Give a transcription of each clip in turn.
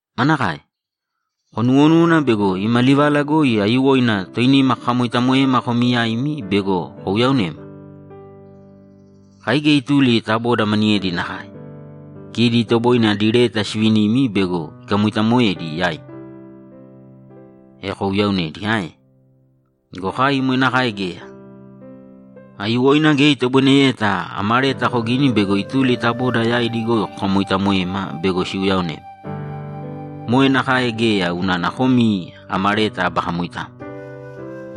Manakae? Konuwonúwana bego ima livala goi aiyuwoina toinima kakamoitamoema komi yaimi bego kouyaonema? Kai geya ituli ta boda maniyedi nakae. Kidi itoboine adi leta sivinimi bego ikamoitamoedi yaimi, e kouyaonedi ae? Go kai moe nakae geya. Aiyuwoina geya itoboineyeta ama leta kogini bego ituli ta boda yaidi goi kokamoitamoema bego siuyaonema. Moe nakae geya unana komi ama leta aba kamoitamo,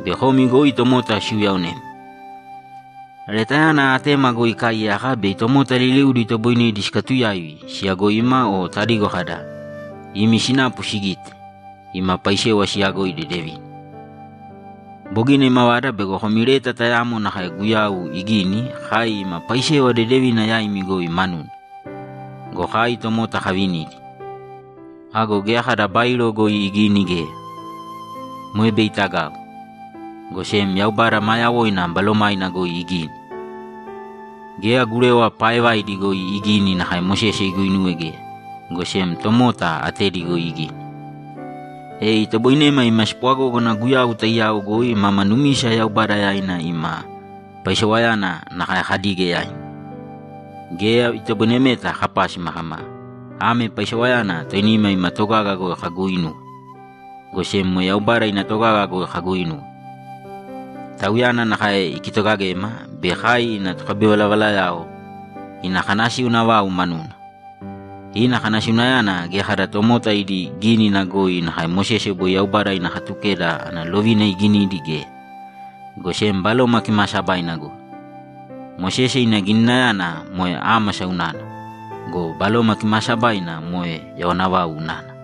bei komi goi tomota siuyaonema. Letayana atema goi ikaaiyaka bei tomota liliudi itoboinedi sikatuyaivi siyagoima o tadigo kada, ‘Imi sinapu sigite, ima paisewa siyagoi dedevina.’ Bogina imavada bego komi leta tayamo nakae Guyau igini kai ima paisewa dedevina yaimi goi manuna go, kai tomota kavinidi. Ago geya kada bairo goi igini geya. Moe bei itagau. Go sem Yaubada maa yawoina Balomaina goi igini. Geya gurewa paaevaidi goi igini nakae Mosese iguinuwe geya, go sem tomota atedi goi igini. E itoboinema ima spwagógana Guyau taiyao goi mama numisa Yaubada yaina ima paisewayana nakae kadige yaimi. Geya itoboinemeta kapásima kama, ‘Ame paisewayana toinima ima togaga goi kaguuinuwe.’ Go sem moe Yaubada ina togaga goi kaguuinuwe. Tauyana nakae ikitogagema bei kai ina tokabivalavalayao ina kanasiuna vau manuna. Ina kanasiunayana geya kada tomota idi gínina goi nakae Mosese boi Yaubada ina Katukeda ana lovina iginidi geya, go sem Baloma Kimaasabaina goi. Mosese ina gininayana moe ámasa unana go, Baloma Kimaasabaina moe yawana vau unana.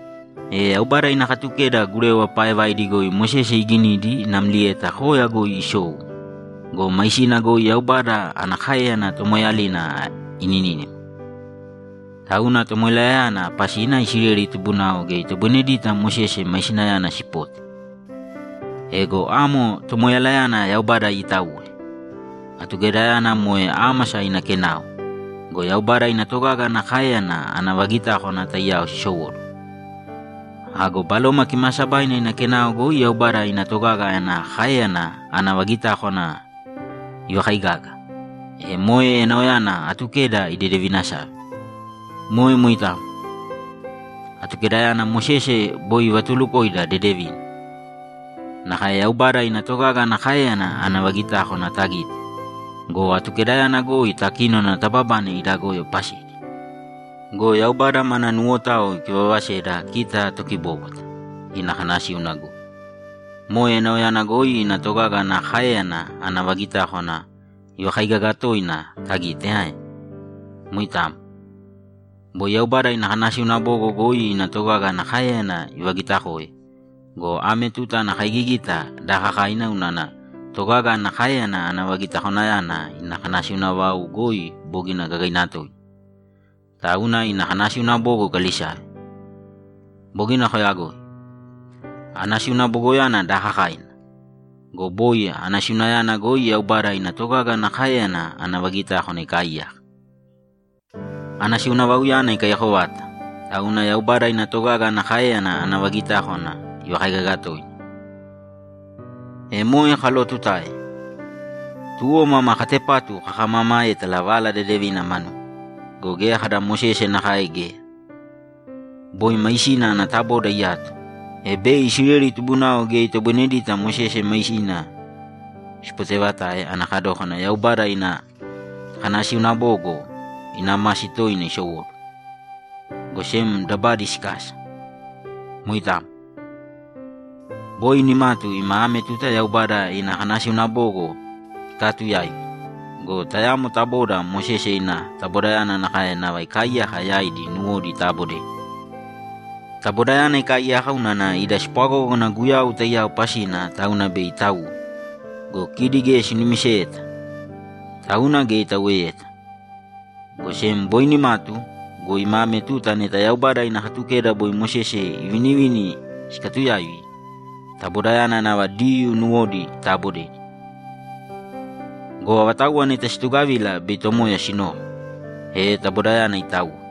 E Yaubada ina Katukeda gurewa paaevaidi goi Mosese iginidi namlieta koya goi isou go, maisina goi Yaubada ana káeyana tomoeeyalina ininínima. Tauna tomoeyalayana pasina Isileli tubunao geya itoboinedita Mosese maisinayana sipote. Ego amo tomoeyalayana Yaubada iitauwe. Atukedayana moe ámasa ina kenao go, Yaubada ina togaga ana káeyana ana vagitákwana taiyao sisowóduwo. Ago Baloma Kimaasabaina ina kenao goi Yaubada ina togaga ana káeyana ana vagitákwana ivakaigaga, e moe enaoyana Atukeda idedevinasave. Moe moitamo. Atukedayana Mosese boi ivatuulukoida dedevina, nakae Yaubada ina togaga ana káeyana ana vagitákwana tagite go, Atukedayana goi takínona tababane ida goyo pasidi. Go Yaubada mana nuwotao ikivavaseda kita tokibóbwata ina kanasíuna goi. Moe enaoyana goi ina togaga ana káeyana ana vagitákwana ivakaigaga toina tagite ae? Moitamo. Boi Yaubada ina kanasiuna bogo goi ina togaga ana káeyana ivagitakoe go, ame tuta ana kaigigita daakakaina unana togaga ana káeyana ana vagitakwanayana ina kanasiuna vau goi bogina gagaina toina. Tauna ina kanasiuna bogo ikalisave. Bogina koyagoi. Anasíuna bogoyana daakakaina go, boi anasiunayana goi Yaubada ina togaga ana káeyana ana vagitákwana ikaaiyaka. Anasiuna vauyana ikaiyako vata, tauna Yaubada ina togaga ana káeyana ana vagitákwana ivakaigaga toina. E moe kalootutae, tuwo mama katepatu kakamamaétala Vala Dedevina manuna. Go geya kada Mosese nakae geya. Boi maisina ana taboda iyato, e bei Isileli tubunao geya itoboinedita Mosese maisina sipotevatae ana kadókana Yaubada ina kanasiuna bogo ina masi toina isowóduwo, go sem dabadi sikasa. Moitamo. Boi nimatu ima ame tuta Yaubada ina kanasiuna bogo sikaatuyaivi go, tayamo taboda Mosese ina tabodayana nakae nava ikaaiyaka yaidi nuwodi itaabodedi. Tabodayana ikaaiyaka unana ida spwagógana Guyau taiyao pasina tauna bei itauwe go, kidi geya sinumiseyeta, tauna geya itauweyeta. Go sem boi nimatu go, ima ame tuta neta Yaubada ina Katukeda boi Mosese ivinivini sikatuyaivi, tabodayana nava Diyuu nuwodi itaabodedi. Go avatauwa neta situgavila bei Tomoya sinoko, e tabodayana itauwe.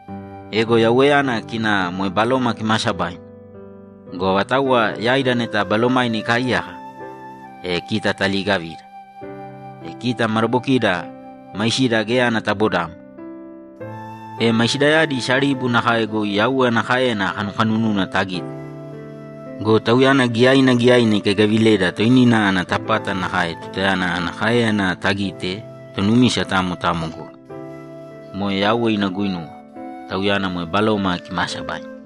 Ego Yauweyana kina moe Baloma Kimaasabaina go, avatauwa yaida neta Balomaina ikaaiyaka, e kita taliigavida. E kita madabokida maisida geya ana tabodamo, e maisidayadi saribu nakae goi Yauwe ana káeyana kanukanununa tagite go, Tauyana giyaina giyaina ikaigaavileda toinina ana tapata nakae tutayana ana káeyana tagite tonumisa tamo tamo goi. Moe Yauwe ina guinuwa; Tauyana moe Baloma Kimaasabaina.